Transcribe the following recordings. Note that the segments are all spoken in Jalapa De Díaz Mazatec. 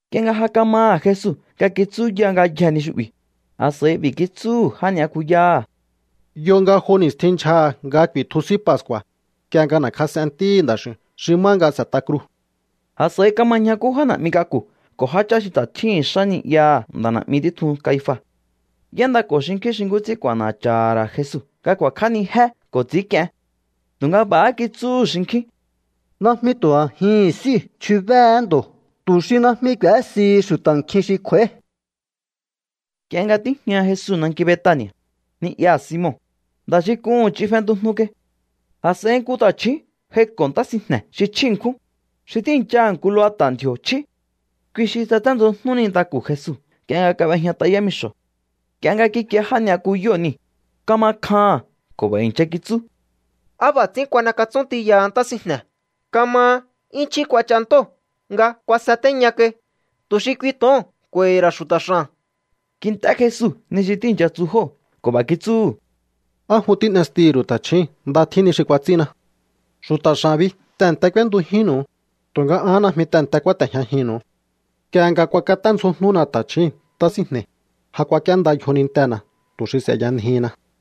Nk'ie nga ja kamaha̱ Jesu nga kitsúya ngayjee̱ ni xu'bi̱, a̱s'a̱i b'i̱ kitsúhu̱ já ni'yakuyáha̱: —Yo nga jo ni̱stjin ndyjaha̱ nga ku̱i̱tju S'í Pascu̱a̱, nk'ie nga n'e̱kjas'en Ntíhi̱ Nda̱x'i̱u̱n xi má nga s'e̱t'a kruu̱. A̱s'a̱i kama ñjakú já na̱'mi k'aku̱ ko̱ jáchá xi ta̱ tjíhi̱n xá ni'yaha̱ nda̱ na̱'mi títjun Caifa. Y'éndako̱ xinkjín xi nkú ts'ín k'u̱a̱na̱cha̱ha̱ ra̱ Jesu nga ku̱a̱kj'ánijé ko̱ ts'i̱ínk'ien. Tu̱nga b'a̱há kitsúhu̱ xinkjín: —Najmi tu̱ a̱jihi̱n s'íu̱ chjubéé ndo̱ tu̱ xi najmi k'u̱ésihi xu̱ta̱ nkjin xi kj'u̱a̱í. Nk'ie nga tíjña Jesu nanki Betani̱a̱, ni'yaha̱ Simon, nda̱ xi k'uhu̱n ch'in fentujnu kai, a̱s'a̱i nku ta̱chju̱ún j'aiko̱ ntá sinjne̱ xi chjí ṉkjún, xi tíi̱nchaha̱ nku lubata̱ ndji̱o̱ chjí. Kui xi tsaténdzjojnú nintaku̱ Jesu nk'ie nga kab'ejñat'a yámixo̱. Nk'ie nga kikie já ni'yakuyóo̱ niu̱, kama kjaha̱n ko̱ b'a̱ i̱ncha kitsú: —¿Á b'a̱ ts'ín kuan'ekatsún tiyaha ntá sinjne̱? Kamahá 'yún chjí kuach'a ntóo̱ nga kuasatéña kai, tu̱ xi kui to̱oo̱n k'u̱a̱i̱hi̱ ra̱ xu̱ta̱ x'a̱n. Kint'é Jesu ni xi tíi̱ncha tsu jóo̱ ko̱ b'a̱ kitsúhu̱: —¿Á jun tín'estihi̱ ru̱u ta̱chjíi̱n? Nda tjín ni xi kuats'ínna. Xu̱ta̱ x'a̱n bi tehe̱nte k'úéntujínnu̱u, tu̱nga an najmi tehe̱nte kúáte̱jñajinnu̱u. Nk'ie nga kuakaténdzjojnúna ta̱chjíi̱n ntá sinjne̱i̱, ja kuak'íénda yjonintena̱ tu̱ xi s'e̱yanjihinna.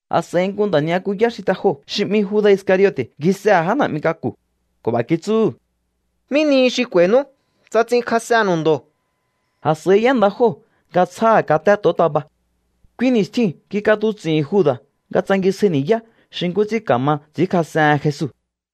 A̱s'a̱i nku nda̱ ni'yakuyá xi te joo̱ xi 'mi Juda̱ Iscariote̱ ngjisehe̱ já na̱'mi k'aku̱ ko̱ b'a̱ kitsúhu̱: —¿Mí nihi xi k'u̱a̱i̱nú tsa ts'inkjas'ennu̱u ndo̱? A̱s'a̱i y'énda jóo̱ nga tsjáha̱ katé to̱ontaba. Kui ni̱stjiu̱n kik'atuts'i̱hi̱n Juda̱ nga tsangisjáí ni̱yá xi nkú ts'ín ka̱ma ts'i̱ínkjas'ehen Jesu.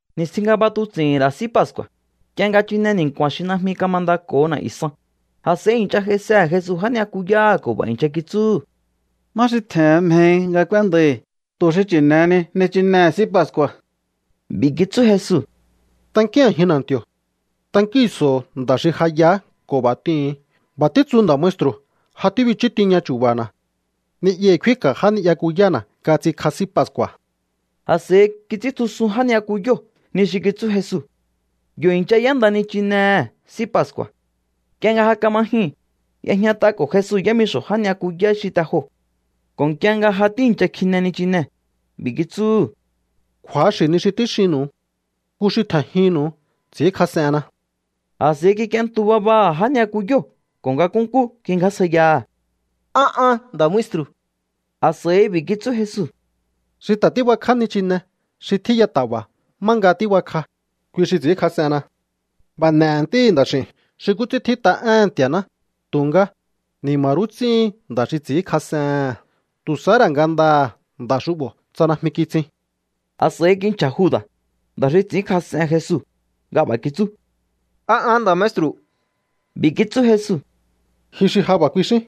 Ni̱stjin nga b'atuts'i̱hi̱n ra̱ S'í Pascu̱a̱, nk'ie nga chine ni̱nku̱a̱n xi najmi kamandako̱ho na̱'yu̱ san, a̱s'a̱i i̱ncha j'aisehe̱ Jesu já ni'yakuyáha̱ ko̱ b'a̱ i̱ncha kitsúhu̱: —¿Má xi tje̱hen mjehi nga k'úéndai̱ tu̱ xi chi̱ne̱heni nichinehe̱ S'í Pascu̱a̱? B'i̱ kitsú Jesu: —Tankíún a̱jin na̱nti̱o̱. Tankíhi̱nso̱o nda xi ja yaá ko̱ b'a̱ t'ihu̱un: “B'a̱ títsu nda̱ maestru̱: Ja tíbichú tiña chu̱ba̱na̱. Ni'yahi̱ kfínka̱ já ni'yakuyána̱ nga ts'inkj'a S'í Pascu̱a̱.” A̱s'a̱i kits'íntjusun já ni'yakuyóo̱ ni xi kitsú Jesu. Yo̱ i̱ncha y'énda nichinehe̱ S'í Pascu̱a̱. Nk'ie nga ja kama jyuu̱n, y'ejñat'ako̱ Jesu yámixo̱ já ni'yakuyá xi te joo̱ ko̱ nk'ie nga ja tíi̱ncha kjine nichinee̱, b'i̱ kitsúhu̱: —Kju̱axi̱ ni xi tíxinnu̱u. Nku xi tje̱njinnu̱u ts'i̱ínkjas'enna. A̱s'a̱i kik'ientu babaha̱ já ni'yakuyóo̱ ko̱ nga nkúnkú kingjásjaiyaha̱: —¿A an, nda̱ maestru̱? A̱s'a̱i b'i̱ kitsú Jesu: —Xi ta̱ tíbakj'á nichine xi tjíya ta̱ba̱ má nga tíbakj'a, kui xi ts'i̱ínkjas'enna. B'a̱ n'e̱he̱ Ntíhi̱ Nda̱x'i̱u̱n xi nkú ts'ín tjít'a éhe̱n Nti̱a̱ná, tu̱nga, ¡ni̱ma̱ rú ts'íhin nda̱ xi ts'i̱ínkjas'ehe̱n! Tu̱ sahá ra̱ ngandaha̱ nda̱ xu'bo̱ tsa najmi kitsin. A̱s'a̱i kinchja̱ Juda̱, nda̱ xi ts'i̱ínkjas'en Jesu, nga b'a̱ kitsú: —¿A an, nda̱ maestru̱? B'i̱ kitsú Jesu: —Ji xi ja b'a̱ kuixín.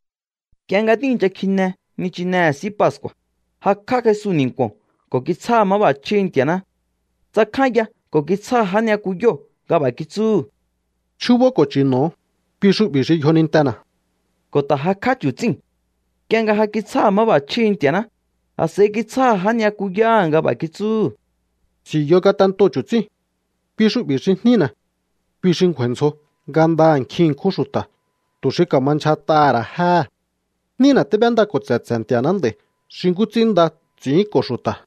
Nk'ie nga tíi̱ncha kjine nichinehe̱ S'í Pascu̱a̱, jakj'á Jesu ni̱nku̱o̱n ko̱ kitsjáha̱ máb'a̱chjíhi̱ Nti̱a̱ná. Tsakjánya ko̱ kitsjáha̱ já ni'yakuyóo̱ nga b'a̱ kitsúhu̱: —Chjúbó ko̱ chi̱no̱o. Kui xu'bi̱ xi yjonintena̱. Ko̱ ta̱ jakj'á chu̱tsíu̱n. Nk'ie nga ja kitsjáha̱ máb'a̱chjíhi̱ Nti̱a̱ná, a̱s'a̱i kitsjáha̱ já ni'yakuyáha̱ nga b'a̱ kitsúhu̱: —S'i̱u̱yo ngatentoo̱ chu̱tsíi̱n. Kui xu'bi̱ xi jnína̱. Kui xi ngju̱a̱i̱ ndzjoho ngandaha̱ nkjin ṉkjún xu̱ta̱ tu̱ xi ka̱ma ndyjat'aha̱ ra̱ jéhe̱. Jnína tíb'éndako̱ tse̱tse̱ Nti̱a̱ná nd'a̱i̱ xi nkú ts'ín nda ts'i̱ínko̱ xu̱ta̱.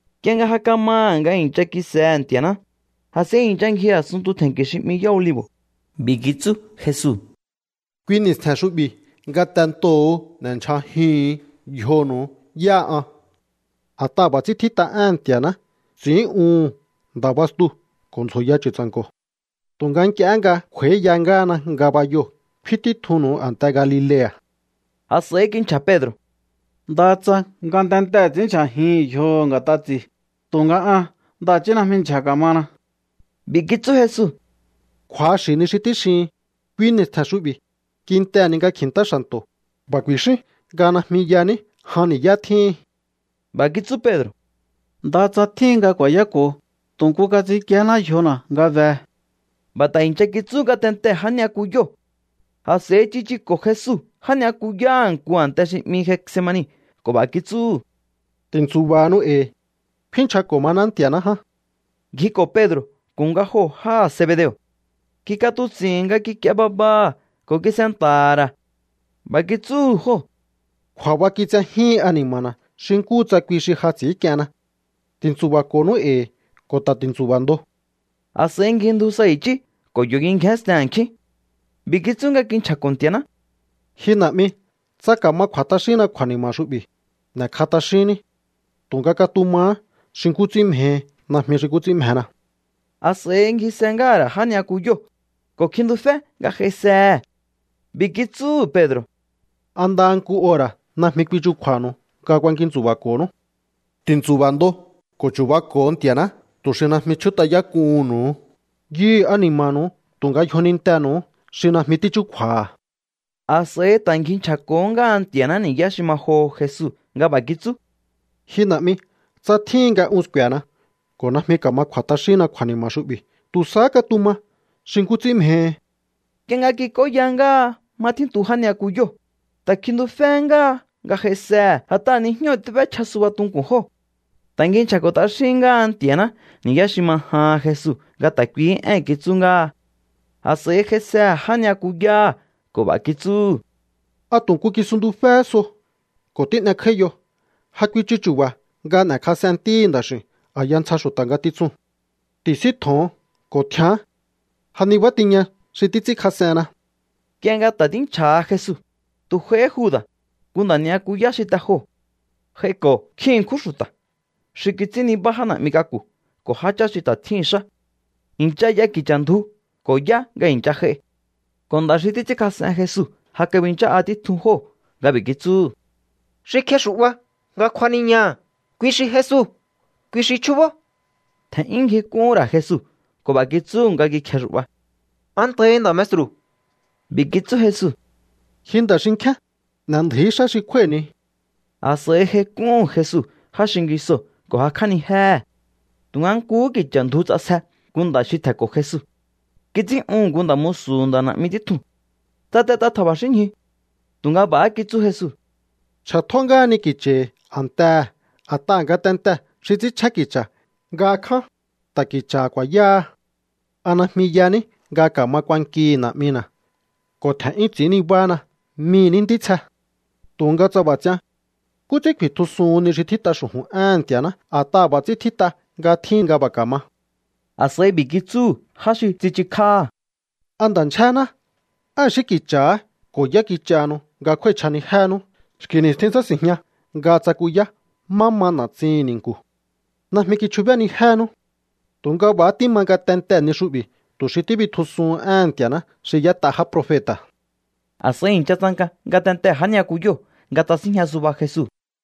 Nk'ie nga ja kamaha̱ nga i̱ncha kisehe̱ Nti̱a̱ná, a̱s'a̱i i̱ncha ngji a̱sunntu tje̱nki̱ xi 'mi Yá Olivo̱. B'i̱ kitsú Jesu: —Kui ni̱stje̱n xu'bi̱ ngatentoho̱o n'e̱ndyja̱jihu̱un yjonu̱u yáha an. A̱t'aha̱ b'a̱ ts'ín tjít'a éhe̱n Nti̱a̱ná: “Ts'in'úhu̱n nda̱ bastuu̱ ko̱ ndzjo̱ya chu̱tsa̱nko̱.” Tu̱nga nk'iehé nga kj'u̱a̱íya ngáhana ngabayoo̱, kfín títjunnu̱u a̱nte Galilea̱. A̱s'a̱i kinchja̱ Pedro̱: —Ndaha tsa ngatentee̱ ts'i̱ínndyja̱jihi̱n yjoho̱ nga̱t'a ts'i̱i, tu̱nga an ndaha̱chí najmi ndyja̱ ka̱mana. B'i̱ kitsú Jesu: —Kju̱axi̱ ni xi tíxihin. Kui ni̱stje̱n xu'bi̱, kintehe̱ ni nga kji̱ntá xa̱nto̱, b'a̱ ku̱i̱xín nga najmi yaní jan ni̱yá tjíhin. B'a̱ kitsú Pedro̱: —Ndaha tsa tjíhin nga ku̱a̱yáko̱ho, tu̱ nku nga ts'inkíéná yjona̱ nga behe. B'a̱ ta̱ i̱ncha kitsú ngatentee̱ já ni'yakuyóo̱. A̱s'a̱i tsichuko̱ Jesu já ni'yakuyáha̱ nku a̱nte xi 'mi Getsemani ko̱ b'a̱ kitsúhu̱: —Ti̱ntsu̱ba̱hanu e̱i̱. Kfín nchjako̱ maná Nti̱a̱ná ján. Ngjiko̱ Pedro̱ ko̱ nga joo̱ jáha̱ Zebedeo̱. Kik'atuts'i̱hi̱n nga kik'ie babaha̱ ko̱ kis'enta̱ha̱ ra̱. B'a̱ kitsúhu̱ jóo̱: —Kju̱a̱ba kitsejíhin ani̱ma̱na̱ xi nkúhu tsa kui xi ja ts'i̱ínk'ienna. Ti̱ntsu̱ba̱ko̱nú e̱i̱ ko̱ ta̱ ti̱ntsu̱ba̱ ndo. A̱s'a̱i ngjindju sa i̱chí ko̱ yo̱ kingjénsten a̱nkjín. B'i̱ kitsú nga kinchja̱ko̱ Nti̱a̱ná: —Ji Na̱'mi, tsa ka̱ma kj'u̱a̱ t'axínna kju̱a̱ni̱ma̱ xu'bi̱, n'e̱kj'a t'axínní. Tu̱nga katumahá xi nkú ts'ín mjehi, najmi xi nkú ts'ín mjena. A̱s'a̱i ngjise ngáha̱ ra̱ já ni'yakuyóo̱, ko̱ kjintufé nga j'aisehe̱. B'i̱ kitsúhu̱ Pedro̱: —¿A ndaha nku ora̱ najmi kuichukju̱a̱nu̱u nga kuakintsu̱ba̱ko̱nú? Ti̱ntsu̱ba̱ ndo ko̱ chu̱bako̱o Nti̱a̱ná tu̱ xi najmi chjút'ayák'uhu̱nnu̱u. Yuhu̱ ani̱ma̱nu̱u tu̱nga yjonintenu̱uhú xi najmi tíchúkju̱a̱ha̱. A̱s'a̱i ta̱ ngji nchja̱ko̱hó ngáha Nti̱a̱ná ni̱yá xi ma joho Jesu nga b'a̱ kitsú: —Ji Na̱'mi, tsa tjíhin nga un sku̱e̱na ko̱ najmi ka̱ma kj'u̱a̱ t'axínna kju̱a̱ni̱ma̱ xu'bi̱, tu̱ sahá katuma xi nkú ts'ín mjehi. Nk'ie nga kik'óya ngáha má tjíntu já ni'yakuyóo̱, ta̱ kjintuféhé ngáha nga j'aisehe̱ a̱t'aha̱ nijñóo̱ tíb'échja suba tunku̱n jóo̱. Ta̱ ngji nchja̱ko̱ t'axíhín ngáha Nti̱a̱ná ni̱yá xi ma jahan Jesu nga ta̱ kuihí én kitsú ngáha. A̱s'a̱i j'aisehe̱ já ni'yakuyáha̱ ko̱ b'a̱ kitsúhu̱: —¿A tu̱ nku kisuntuféhé so ko̱ tín'ekj'áíyo? Ja kuichu chu̱ba̱ nga n'e̱kjas'en Ntíhi̱ Nda̱x'i̱u̱n a̱ya ntsja xu̱ta̱ ngatitsuu̱n. Ti̱síntjo̱on ko̱ tjián. Ja nibá tiña xi títs'ínkjas'enna. Nk'ie nga ta̱ tínchja̱ha Jesu, tu̱ j'aihí Juda̱, nku nda̱ ni'yakuyá xi te joo̱. J'aiko̱ nkjin ṉkjún xu̱ta̱ xi kits'ín nibá já na̱'mi k'aku̱ ko̱ jáchá xi ta̱ tjíhi̱n xá. I̱ncha y'a ki̱cha̱ ndju ko̱ yá nga i̱ncha j'ai. Ko̱ nda̱ xi títs'ínkjas'en Jesu ja kabinchá'a títjun jóo̱ nga b'i̱ kitsúhu̱: —Xi kjexu̱'ba nga kjuaniñaha̱, kui xi Jesu. Kui xi chjúbó. Tje̱n'yún ngjik'úhún ra̱ Jesu ko̱ b'a̱ kitsúhu̱ nga kikjexu̱'ba: —Antahi, nda̱ maestru̱. B'i̱ kitsú Jesu: —Ji nda̱ xinkjíán, n'e̱ndju̱í xá xi kjúái̱hini. A̱s'a̱i j'aik'úhu̱n Jesu já xingisoo̱ ko̱ jakj'ánijéhe̱. Tu̱nga nkuhú ki̱cha̱ ndju ts'asje nku nda̱ xi tje̱nko̱ Jesu. Kits'ín'uhu̱n nku nda̱ musu̱hu̱ nda̱ na̱'mi títjuu̱n. Tsatet'a tja̱ba̱xínñju. Tu̱nga b'a̱há kitsú Jesu: —Chj'atjó ngáhani ki̱cha̱hi̱ a̱ntehe̱. A̱t'aha̱ ngatentee̱ xi ts'ínchjén ki̱cha̱ nga kján, ta̱ ki̱cha̱ ku̱a̱yáha. ¿A najmi yaní nga ka̱ma kuankihi̱ Na̱'mina̱ ko̱ tje̱n'yún ts'i̱ín nibáhána mii̱ ní ntítsje? Tu̱nga tsa b'a̱ ts'ian, ¿nkú ts'ín ku̱i̱tjusuhun ni xi tjít'a xu̱ju̱n éhe̱n Nti̱a̱ná? A̱t'aha̱ b'a̱ ts'ín tjít'a nga tjíhin nga b'a̱ ka̱ma. A̱s'a̱i b'i̱ kitsúhu̱ já xi tsichukj'áha̱: —¿A nda̱ ndyjéná? ¿Á i̱xí ki̱cha̱há ko̱ yá kich'ahanu nga kjúái̱chj'anijéhenú? Xki̱ ni̱stjin tsási̱njña nga tsakuyá má ma na̱tsihi̱n ni̱nku̱. Najmi kichjubénijénú. Tu̱nga b'a̱há tíma ngatentee̱ ni xu'bi̱ tu̱ xi tíbitjusuhun éhe̱n Nti̱a̱ná xi y'ét'a já profeta̱. A̱s'a̱i i̱ncha tsanka ngatentee̱ já ni'yakuyóo̱ nga tsasínjña suba Jesu.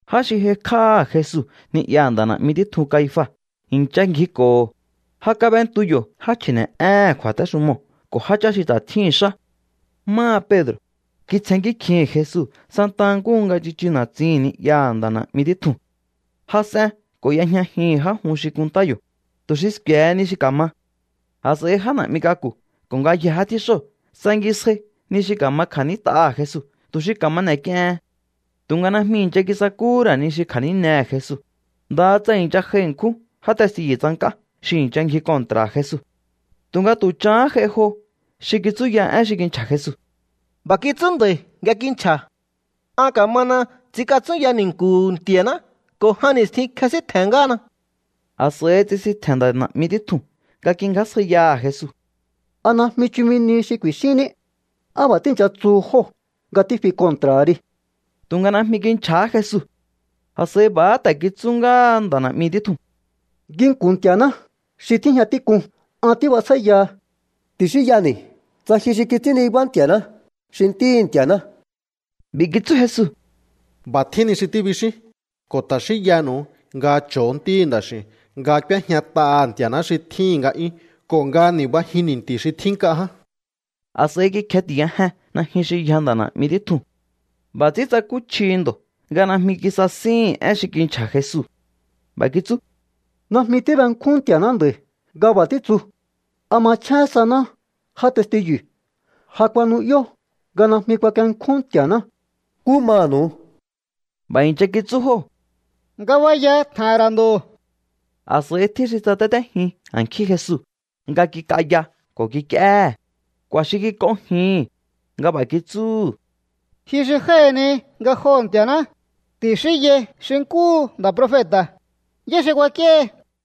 Já xi j'aikj'áha̱ Jesu ni'yaha̱ nda̱ na̱'mi títjun Caifa i̱ncha ngjiko̱ho̱. Ja kab'entu yo̱ já chji̱ne̱'éhe̱n kju̱a̱téxumoo̱ ko̱ jáchá xi ta̱ tjíhi̱n xá. Máha Pedro̱, kitsjennkí kjihi̱n Jesu santaha nkúhu nga tsichu na̱tsin ni'yaha̱ nda̱ na̱'mi títjuu̱n. Jas'en ko̱ y'ejñajihi̱n já jun xi kunntá yo̱, tu̱ xi sku̱e̱he ni xi ka̱ma. A̱s'a̱i já na̱'mi k'aku̱ ko̱ ngayjee̱ já tjíxóo̱ tsangisjai ni xi ka̱ma kja̱nít'aha̱ Jesu tu̱ xi ka̱ma n'e̱k'iehen. Tu̱nga najmi i̱ncha kisakúhú ra̱ ni xi kja̱nínehe̱ Jesu, ndaha tsa i̱ncha j'ai ṉkjún já testiyu̱ tsank'á xi i̱ncha ngji kontra̱ha̱ Jesu. Tu̱nga tu̱ chahán j'ai jo xi kitsúya én xi kinchja̱ Jesu: —B'a̱ kitsú nda̱i̱ nga kinchja̱: “An ka̱mana ts'inkatsúnya ni̱nku̱hu̱ Nti̱a̱ná ko̱ jan ni̱stjin kjesíntje̱n ngáhana.” A̱s'a̱i tsisintje̱n nda̱ na̱'mi títjuu̱n nga kingjásjaiyaha̱ Jesu: —¿A najmi chumi nihi xi ku̱i̱xínní? ¿Á b'a̱ tíi̱ncha tsuhu jóo̱ nga tífi kontra̱ha ri? Tu̱nga najmi kinchja̱há Jesu. A̱s'a̱i b'a̱há ta̱ kitsú ngáha nda̱ na̱'mi títjuu̱n: —Nginku̱n Nti̱a̱ná xi tíjña tík'un an tíbjasjáíyaha. Ti̱xínyani̱ tsa ji xi kits'ín nibá Nti̱a̱ná, xi Ntíhi̱ Nti̱a̱ná. B'i̱ kitsú Jesu: —B'a̱ tjín ni xi tíbixín. Ko̱ ta̱ xínyanu̱u nga cho̱o Ntíhi̱ Nda̱x'i̱u̱n nga k'úéjñat'aha̱ Nti̱a̱ná xi tjíhi̱n nga'yún ko̱ nga ni̱bajin ni̱nti̱ xi tjín nk'a ján. A̱s'a̱i kikjeti̱yajen najyun xi yja nda̱ na̱'mi títjuu̱n. B'a̱ ts'ín tsakúchji ndo̱ nga najmi kisasíhi̱n én xi kinchja̱ Jesu. B'a̱ kitsú: —¡Najmi tíbenkjún Nti̱a̱ná nda̱i̱ nga b'a̱ títsu! ¿A machjén saná já testiyu̱? Ja kuanu'yó nga najmi kuakienkjún Nti̱a̱ná. ¿Nkú manu̱u? B'a̱ i̱ncha kitsú jóo̱: —Ngabaya tje̱he̱n ra̱ ndo̱. A̱s'a̱i tjín xi tsatétéjin a̱nkjín Jesu nga kik'aya ko̱ kik'íéhe̱. K'u̱a̱ xi kik'onjihi̱n nga b'a̱ kitsúhu̱: —Ji xi jái̱ni ngajoho̱ Nti̱a̱ná, ti̱xínyai xi nkúhu nda̱ profeta̱, ¿yá xi kuak'íéhi?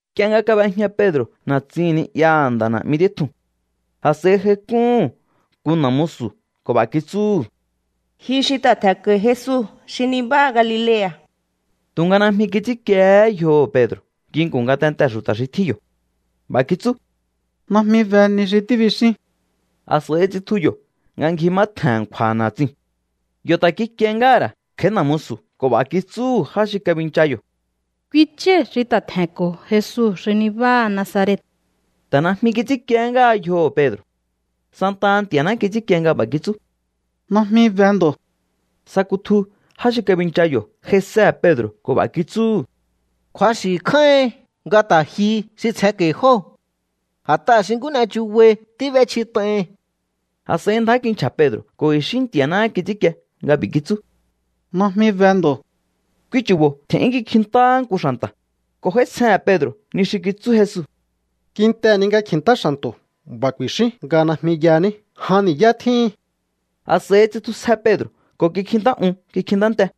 Nk'ie nga kab'ejña Pedro̱ na̱tsin ni'yaha̱ nda̱ na̱'mi títjuu̱n, a̱s'a̱i j'aik'úhu̱n nku na̱ musu̱ ko̱ b'a̱ kitsúhu̱: —Ji xi ta̱ tje̱nko̱i̱ Jesu xi nibáha Galilea̱. Tu̱nga najmi kits'ínkiehé yjoho̱ Pedro̱ nginku̱n ngatentee̱ xu̱ta̱ xi tjín yo̱. B'a̱ kitsú: —Najmi be ni xi tíbixín. A̱s'a̱i tsitju yo̱ nga ngji má tje̱n a̱nkju̱a̱ na̱tsiu̱n. Yo̱ ta̱ kikiehé ngáha̱ ra̱ kj'a̱í na̱ musu̱ ko̱ b'a̱ kitsúhu̱ já xi kabincha yo̱: —Kui chái̱ xi ta̱ tje̱nko̱ Jesu xi nibáha Nazaret. Ta̱ najmi kits'ínkiehé ngáha yjoho̱ Pedro̱. Santaha Nti̱a̱ná kits'ínkie nga b'a̱ kitsú: —¡Najmi be ndo̱! Sa kutju já xi kabincha yo̱ j'aisehe̱ Pedro̱ ko̱ b'a̱ kitsúhu̱: —Kju̱axi̱ kjáíhin nga ta̱ ji xi tsjenko̱i̱ jóo̱. A̱t'aha̱ xi nkú n'e chubai tíb'échjit'aihin. A̱s'a̱i ndjá kinchja̱ Pedro̱ ko̱ i̱xí Nti̱a̱náhá kits'ínkie nga b'i̱ kitsú: —¡Najmi be ndo̱! Kui chu̱bo̱ tje̱n'yún kikjintáhá nku xa̱nta̱ ko̱ j'áítsjehe̱n Pedro̱ ni xi kitsú Jesu: “Kintehe̱ ni nga kji̱ntá xa̱nto̱, b'a̱ ku̱i̱xín nga najmi yaní jan ni̱yá tjíhin.” A̱s'a̱i tsitjusje Pedro̱ ko̱ kikjintá un kikjintá nte.